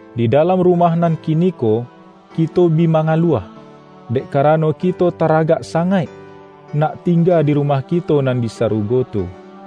Di dalam rumah nan kiniko, kito bi ma-ngaluah, dek karano kito taragak sa-ngaik, nak tingga di rumah kito nan di sarugo tu.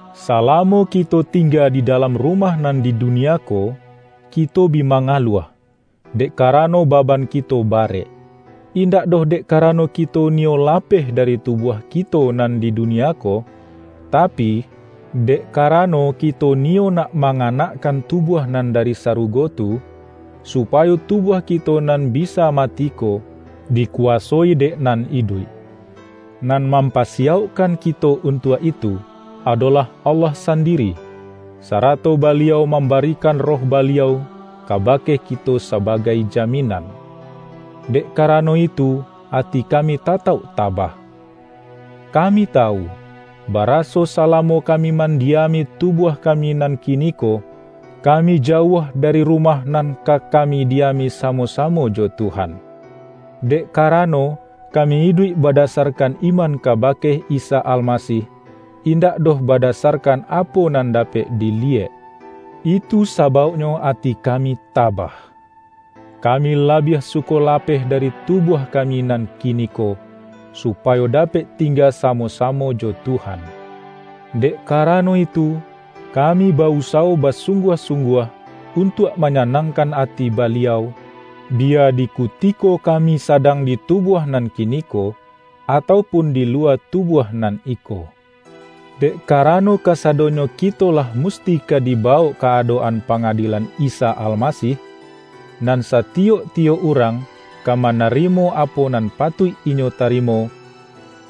salamo kito tingga di dalam rumah nan di dunia ko, ki-to bi mangaluah, dek karano baban kito barek. Indak doh dek karano ki-to niyo lapeh dari tubuah kito nan di dunia ko, tapi, dek karano, kito niyo nak manganakkan tubuah nan dari sarugo tu, supayo tubuah kito nan bi-sa mati ko, dikuwasoi dek nan iduik. Nan mampasiyaukkan kito untuak itu, adolah Allah sandiri, sarato Ba-liau mambarikan Roh Baliau kabake kito sabagai jaminan. Dek karano itu ati kami tatauk ta-bah. Kami tawu, baraso salamo kami mandiami tubuah kami nan kiniko, kami jauah dari rumah nan ka ka-mi diami samo-samo jo Tuhan. Dek karano, kami iduik badasarkan iman kabake Isa Almasih, indak doh bada-sarkan apo nan dapek diliyek, itu sa-bauknyo ati kami tabah. Kami labiah suko lapeh dari tubuah kami nan ki-niko, supayo dapek tingga samo-sa-mo jo Tuhan. Dek karano itu, kami ba-usawo basungguah-sungguah un-tuak manyanangkan ati Baliau, biya di kutiko kami sadang di tubuah nan kiniko, atau pun di luwa tubuah nan iko. Dek karano, kasadonyo kito lah musti ka dibawok ka adok-an panga-dielan Isa Almasih, nan satiyok-tiyok urang ka manarimo apo nan patuik inyo tarimo,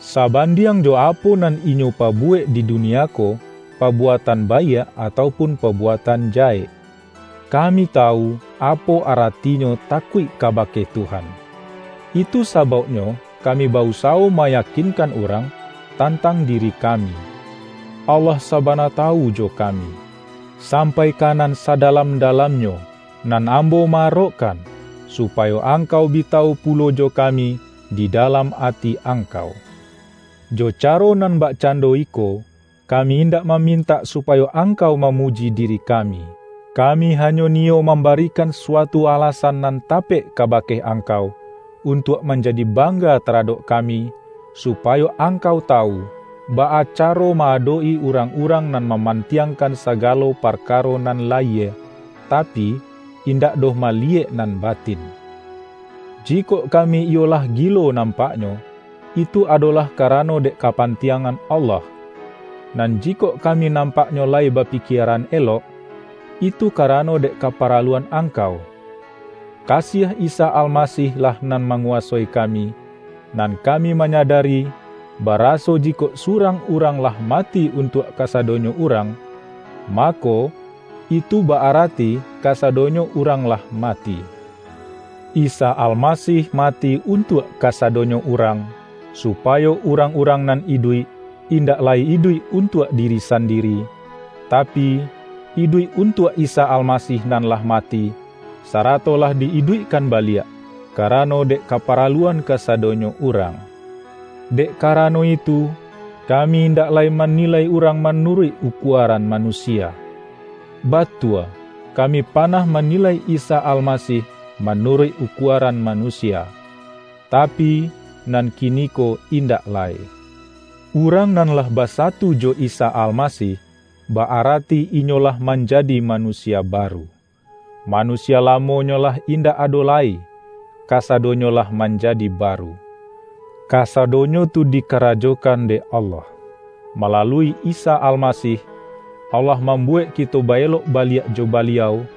sabandiang jo apo nan inyo pabuwek di dunia ko-pabuatan baiak atau pun pabuatan jahek. Kami tawu, apo aratinyo takuik kabake Tuhan; itu sabauknyo kami ba-usawo mayakinkan urang, tantang di-ri kami. Allah sabana tawu jo kami, sampai ka nan sadalam-dalamnyo, nan ambo ma-arokkan, supayo ang-kau bi tawu pulo jo kami di dalam ati angkau. Jo caro nan bakcando iko, kami indak mamintak supayo angkau mamuji diri kami. Kami hanyo niyo mambarikan suatu alasan nan tapek kabake angkau, untuak manjadi bang-ga taradok kami, supayo angkau ta-wu, baa caro ma-adok-i urang-urang nan mamantiangkan sagalo parka-ro nan layie, tapi, indak doh maliyek nan batin. Jikok kami iyo lah gilo nampaknyo, itu adolah karano dek kapantiangan Allah. Nan jikok kami nampaknyo layi bapikieran elok, itu karano dek kaparaluan angkau. Ka-siah Isa Almasih-lah nan manguwasoi kami; nan kami manyadari, baraso ji-kok surang urang lah mati untuak ka-sadonyo urang, mako, itu ba-arati ka-sadonyo urang lah mati. Isa Almasih mati untuak kasadonyo urang, supayo urang-urang nan iduik, indak lai iduik untuak diri sandiri, tapi, iduik untuak Isa Almasih nan lah mati, sarato lah di-iduikkan baliak, karano dek kapa-raluan kasadonyo urang. Dek karano itu, kami indak lai manilai urang manuruik ukuaran ma-nusia. Batua kami panah manilai Isa Almasih manuruik ukuaran manusia, tapi, nan kiniko indak lai. Urang nan lah basatu jo Isa Almasih, ba-arati inyo lah manjadi manusia baru. Manusia lamonyo lah indak ado lai - kasado-nyo lah manjadi baru. Kasadonyo tu dikarajokan dek Allah. Malalui Isa Almasih, Allah mambuwek kito ba-elok baliak jo Baliau,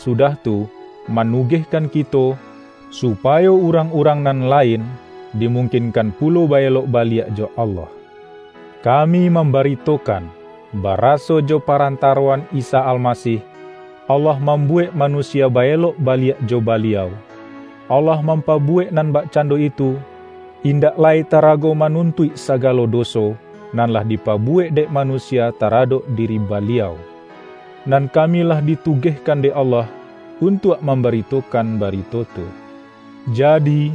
sudah tu, ma-nugehkan kito, supayo urang-urang nan lain dimungkinkan pulo ba-elok baliak jo Allah. Kami mambaritokan, baraso jo pa-rantaroan Isa Almasih, Allah mamhu-wek manusia ba-elok baliak jo Baliau, Allah mampabuwek nan bakcando itu, indak lai tarago manuntuik sagalo doso, nan lah dipabuwek dek manusia taradok diri Baliau. Nan kami lah di-tugehkan dek Allah untuak mamba-ritokan barito tu. Jadi,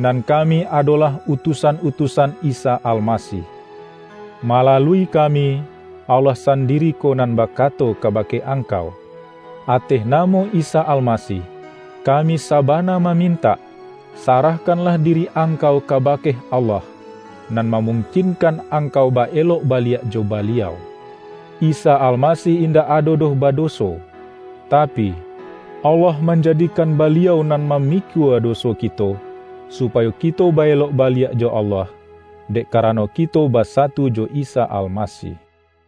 nan kami adolah utusan-utu-san Isa Almasih. Malalui kami, Allah sandiri ko nan bakato kabake angkau. Ateh namo Isa Almasih, kami saba-na mamintak, sarahkanlah diri ang-kau kabake Allah, nan mamungkin-kan angkau ba-elok baliak jo Baliau. Isa Almasih indak ado doh badoso, tapi, Allah manjadikan Baliau nan ma-mikua doso kito, supayo kito ba-elok baliak jo Allah, dek karano kito ba-satu jo Isa Almasih.